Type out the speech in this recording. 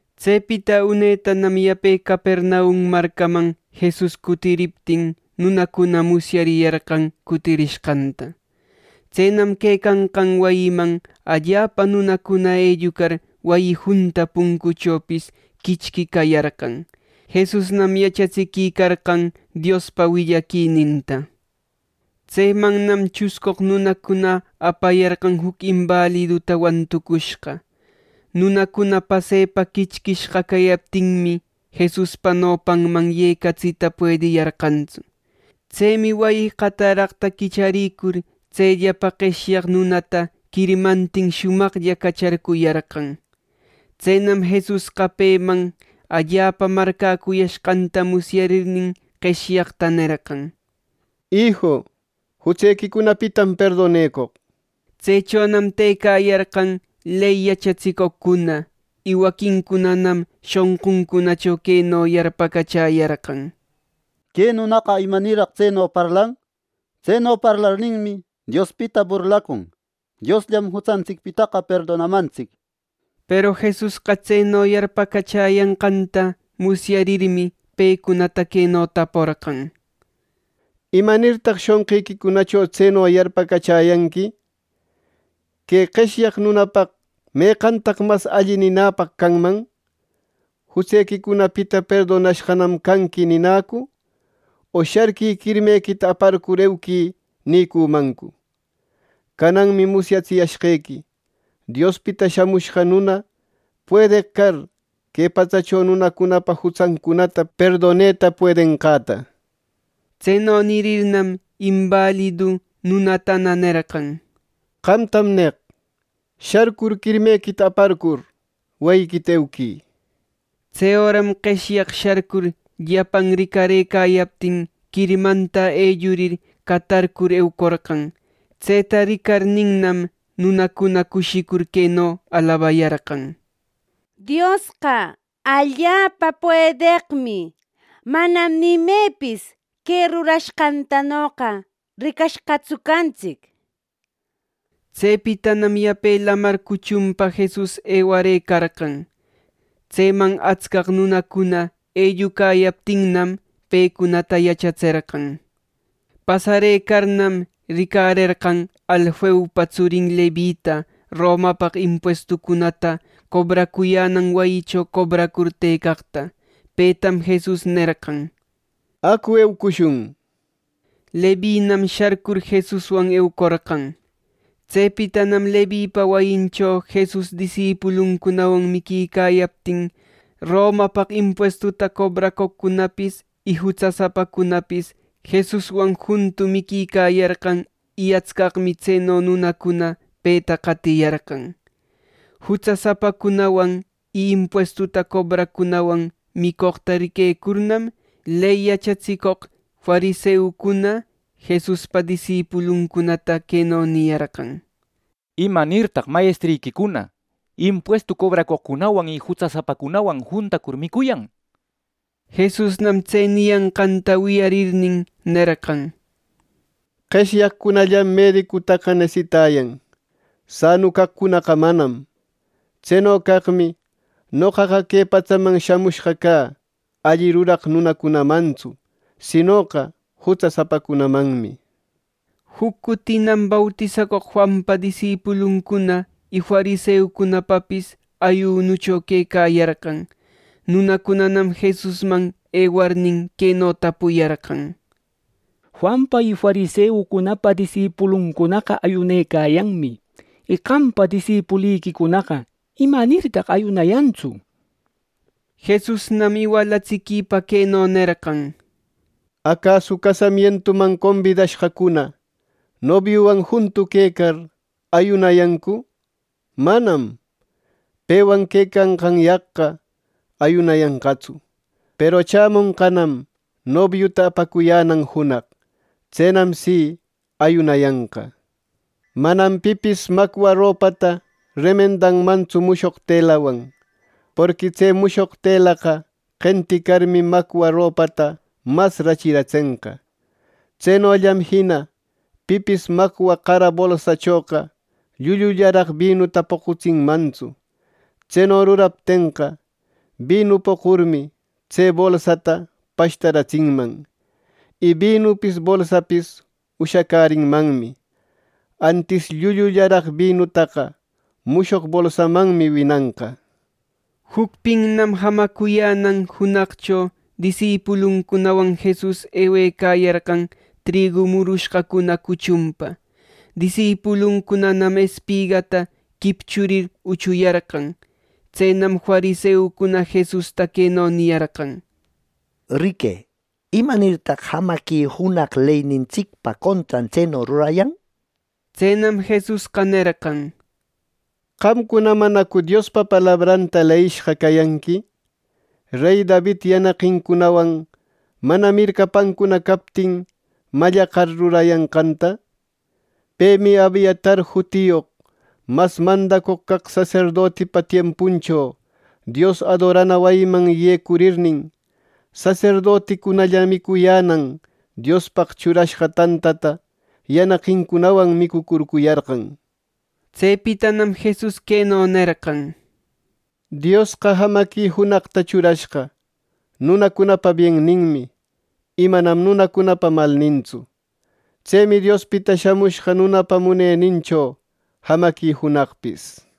Tsepita unetanam yape Capernaum marcaman Jesus cutiriptin nunacuna musyariyarqan cutirishqanta. Tsenam quecanqan wayiman allapa nunacuna ellucar wayi junta puncuchopis quichqui cayarqan. Jesusnam yachatsiquicarqan Diospa willaquininta. Tsemannam chuscoq nunacuna apayarqan juc imbaliduta wantucushqa. Nunacuna pasepa quichquishqa cayaptinmi, Jesuspa nopanman yecatsita puediyarqantsu. Tsemi wayi qataraqta quicharïcur tselläpa qeshyaq nunata quirmantin shumaqlla cacharpuyarqan. Tsenam Jesusqa peman allapa marcäcuyashqanta musyarirnin, qeshyaqta nerqan: —Iju, jutsequicunapitam perdonecoq. Tsechonam tëcayarqan ley yachatsicoqcuna. Y waquincunam shonquncunacho queno yarpacachäyarqan: “Que nunaqa ¿imanirraq tseno parlan! Tseno parlarninmi, Diospita burlacun. Diosllam jutsantsicpitaqa perdonamantsic” nir. Peru Jesusqa tseno yarpacachäyanqanta musyarirmi, pecunata queno taporqan: —¿Imanirtaq shonqiquicunacho tseno yarpacachäyanqui! ¿Que qeshyaq nunapaq meqantaq mas alli ninäpaq canman: ‘Jutsequicunapita perdonashqanam canqui’ ninäcu, o ‘Sharquï, quirmequita aparcur euquï’ nïcümancu! Cananmi musyatsiyashqequi Diospita Shamushqa Nuna, puedeq car que patsacho nunacunapa jutsancunata perdoneta puedenqanta. Tseno nirirnam, imbalidu nunatana nerqan: —Qamtam neq: Sharcur quirmequita aparcur wayiquita euquï. Tse öram qeshyaq sharcur llapan ricarëcayaptin quirmanta ellurir catarcur eucorqan. Tseta ricarninnam, nunacuna cushicur queno alabayarqan: —¡Diosqa allapa puedeqmi! ¡Manam ni imepis que rurashqantanoqa ricashqatsu cantsic! Tsepitanam yape lamar cuchunpa Jesus ewarëcarqan. Tseman atsca nunacuna ellucayaptinnam, pecunata yachatserqan. Pasarëcarnam ricarerqan Alfeupa tsurin Levita Romapaq impuestucunata cobracuyänan wayicho cobracur tëcaqta. Petam Jesus nerqan: —¡Acu eucushun! —nir. Levinam sharcur Jesuswan eucorqan. Tsepitanam Levipa wayincho Jesus disipuluncunawan miquicayaptin Romapaq impuestuta cobracoqcunapis y jutsasapacunapis Jesuswan juntu miquicayarqan, y atscaqmi tseno nunacuna peta qatiyarqan. Jutsasapacunawan y impuestu cobraqcunawan micoqta riquecurnam, ley yachatsicoq fariseucuna Jesuspa disipuluncunata queno niyarqan: —¿Imanirtaq mayestriquicuna impuestu cobracoqcunawan y jutsasapacunawan juntacur micuyan! Jesusnam tse niyanqanta wiyarirnin, nerqan: —Qeshyaqcunallam medicutaqa nesitayan; sanu caqcunaqa manam. Tseno caqmi noqaqa que patsaman shamushqa cä alli ruraq nunacunamantsu, sinoqa jutsasapacunamanmi. Juc cutinam bautisacoq Juanpa disipuluncuna y fariseucunapapis ayunucho quecayarqan. Nunacunanam Jesusman ewarnin, queno tapuyarqan: —Juanpa y fariseucunapa disipuluncunaqa ayunecayanmi, y qampa disipuliquicunaqa ¿imanirtaq ayunayantsu? —nir. Jesusnam iwalatsiquipa queno nerqan: —Acasu casamientuman combidashqacuna nobiuwan juntu quecar, ¿ayunayancu! ¡Manam! Pewan quecayanqanyaq ayunayantsu. Peru chämonqanam nobiuta apacuyänan junaq. Tsenam si, ayunayanqa. “Manam pipis macwa ropata remendanmantsu mushoq telawan, porqui tse mushoq telaqa qenticarmi macwa ropata mas rachirenqa. Tsenollam jina pipis macwa qara bolsachoqa llullullaraq binuta poqutsinmantsu. Tseno ruraptenqa, binu poqurmi, tse bolsata pashtaratsinman, y binupis bolsapis ushacärinmanmi. Antis, llullullaraq binutaqa mushoq bolsamanmi winanqa.” Jucpinnam jamacuyänan junaqcho disipuluncunawan Jesus ewecayarqan trigu murushqacuna cuchunpa. Disipuluncunanam espigata quipchurir uchuyarqan. Tsenam fariseucuna Jesusta queno niyarqan: —Riquë, ¿Imanirtaq jamaqui junaq leynintsicpa contran tseno rurayan? Tsenam Jesusqa nerqan: —Qamcuna ¿manacu Diospa palabranta leyishqa cayanqui, rey David yanaqincunawan mana mircapancuna captin mallaqar, rurayanqanta! Pemi Abiatar jutiyoq mas mandacoq caq saserdotipa tiempuncho Dios adorana wayiman yecurirnin, saserdoticunalla micuyänan Diospaq churashqa tantata yanaqincunawan micucurcuyarqan. Tsepitanam Jesus queno nerqan: —Diosqa jamaqui junaqta churashqa nunacunapa bienninmi, y manam nunapa malnintsu. Tsemi Diospita Shamushqa Nunapa munenincho jamaqui junaqpis.